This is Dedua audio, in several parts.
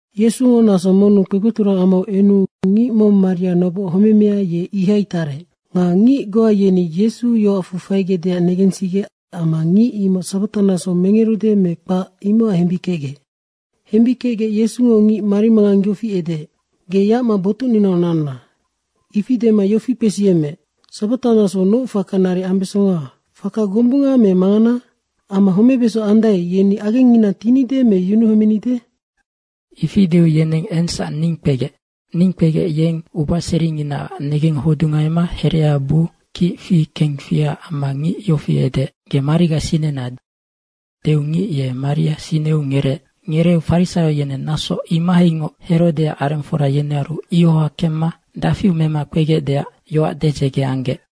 Yesungo naso monnu kpekpeturang amau enu ngic mong maria noboc homemea, ye ihai tarec. Nga ngic goa yeni Yesu yoacfu faigecdeac negensigec amma ngic imoc sabata nasou mengereude me kpac, imocac hembikecgec. Hembikecgec Yesungo ngic marimangang yofi edeec, “Ge yacma botucninau nanna.” ifi dema yofi kpesiyemmeec, “Sabata nasou noc faka naric ambesonga, faka gombunga me mangana? Amma homebeso andae, yeni agengngina tinide me yunuhomenide?” Ifi deu yeneng engsac ning kpegec. Ning kpegec yeng ubaseringinaac negenghodungaima herea buu kic fikengfiha amma ngic yofi edeec, “Ge mariga sinena!” deu ngic ye maria sineu ngereec. Ngereeu farisaio yeneng naso imohaingoc Herodeac arengfora yenearu ioha kemma dafiu mema kpegecdeac yoac dedzege anggec.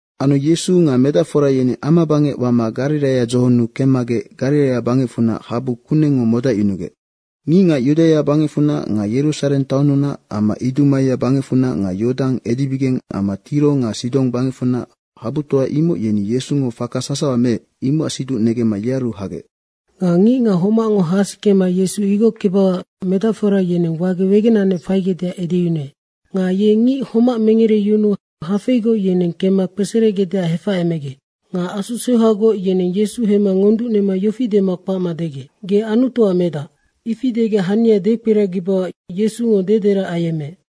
Anu Yesu nga medacfora yeni amabangec wama Gariraia dzohonnu kemmagec Gariraia bangecfunac habu kunengngo modacyunugec. Ngicngac Yudaia bangecfunac nga Yerusareng taonnunac amma Idumaia bangecfunac nga Yodang edibigeng amma Tiro nga Sidong bangecfunac, habutoa imoc yeni Yesungo faka sasawa meec, imocac siduc negemma yearu hagec. Nga Ngicngac homacngo hasikema Yesu igockebauac medacfora yeneng wage wegenac faigecdeac edeyunuec. Nga ye ngic homac mengereyunuu hafeigoc yeneng kemma kpeseregecdeac hefacemegec. Nga asu seuhagoc yeneng Yesu hemma ngonducnema yofi dema kpacma degec, “Genoc Anutuac medac.” Ifi degec hania dekperagibauac Yesungo dederac ayemmeec.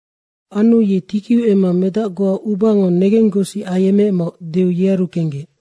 Anu ye tikiu emma medac goa ubango negenggosi ayemmeecmoc, deu yearu kenggec.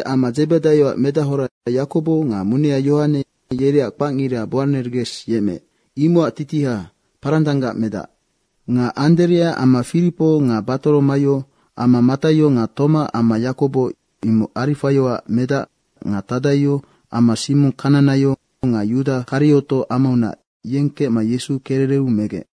amma Dzebedaioac medahora Yakobo nga munea Yohane, yereac kpacngira Boanerges yemerec. Imocac titiha, parandanggac medac. Nga Anderea amma Firipo nga Batoromaio amma Mataio nga Toma amma Yakobo, imoc Arifaioac medac nga Tadaio amma Simong Kananaio nga Yuda Karioto amaunac, yeng kecma Yesu kerereu megec.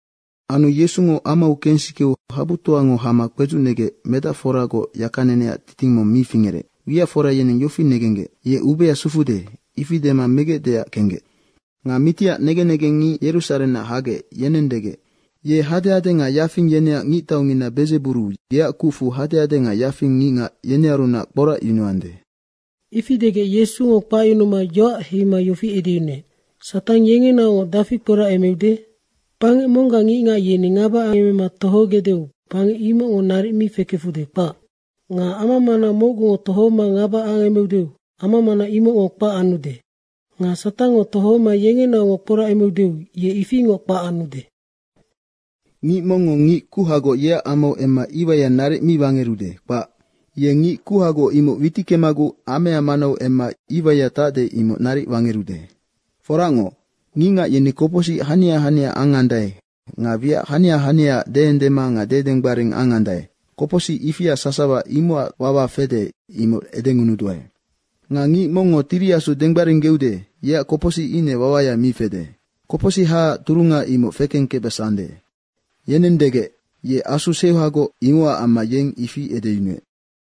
Anu Yesungo amau kensikeu habutoango hama kpedzucnegec medacforagoc yakaneneac titing mong mi fingerec. Wiacfora yeneng yofi negenggec, “Ye ubea sufude.” ifi dema megecdeac kenggec. Nga mitiac negen negengngic Yerusarennac hagec, yeneng degec, “Ye hadehade nga yafing yeneac ngictaungina Bedzeburu, yeac kucfu hadehade nga yafing ngicngac yenearunac kporacande.” Ifi degec Yesungo kpacyunuma yoac heima yofi edeyunuec, “Satang yengenaocngoc dafi kporacemeude? Bangec monggac ngicngac yeni ngaba angemema tohogecdeu bangec imocngo naric mi fekefude, kpac. Nga amamana mocgungo tohoma ngaba angemeudeu amamana imocngo kpac anude. Nga Satangngo tohoma yengenaocngoc kporacemeudeu ye ifingoc kpac anude. Ngic mongngo ngic kuhagoc, yeac amau emma iwaiya naric mi wangerude, kpac. Ye ngic kuhagoc imoc witickemaguc amea manau emma iwaiya tacde, imoc naric wangerude. Foracngoc, ngicngac yeni kopocsic hania hania angandae nga wiac hania haniaac deendema nga dedenggbaring angandae, kopocsic ifia sasawa, imocac wawa fede, imoc edengunuduae. Nga ngic mongngo Tiri Asu denggbaringgeude, yeac kopocsic ine wawaya mi fede. Kopocsihaac turunga imoc fekengkecbesande.” Yeneng degec, “Ye asu seuhagoc.” imocac amma yeng ifi edeyunuec.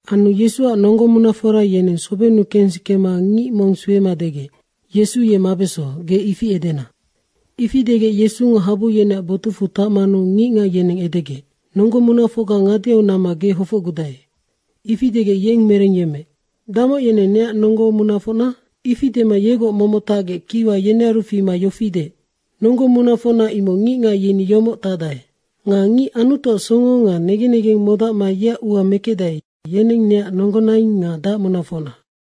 Anu Yesuac nonggo munafora yeneng sobennu kensikema ngic mong suema degec, “Yesu ye mabeso.” ge ifi edena. Ifi degec Yesungo habu yeneac botucfu tacmanu ngicngac yeneng edegec, “Nonggo munafocga ngadeau namma ge hofocgudae.” Ifi degec yeng merengyemmeec, “Damoc yeneng neac nonggo munafocna?” Ifi dema yegoc momoc tacgec, kiwa yenearu fima yofi deec, “Nonggo munafocna imoc ngicngac ngeni yomoc tacdae. Nga ngic Anutuac songo nga negen negeng modacma yeac ua mekecdae, yeneng neac nonggo naing nga dacmunafocna.”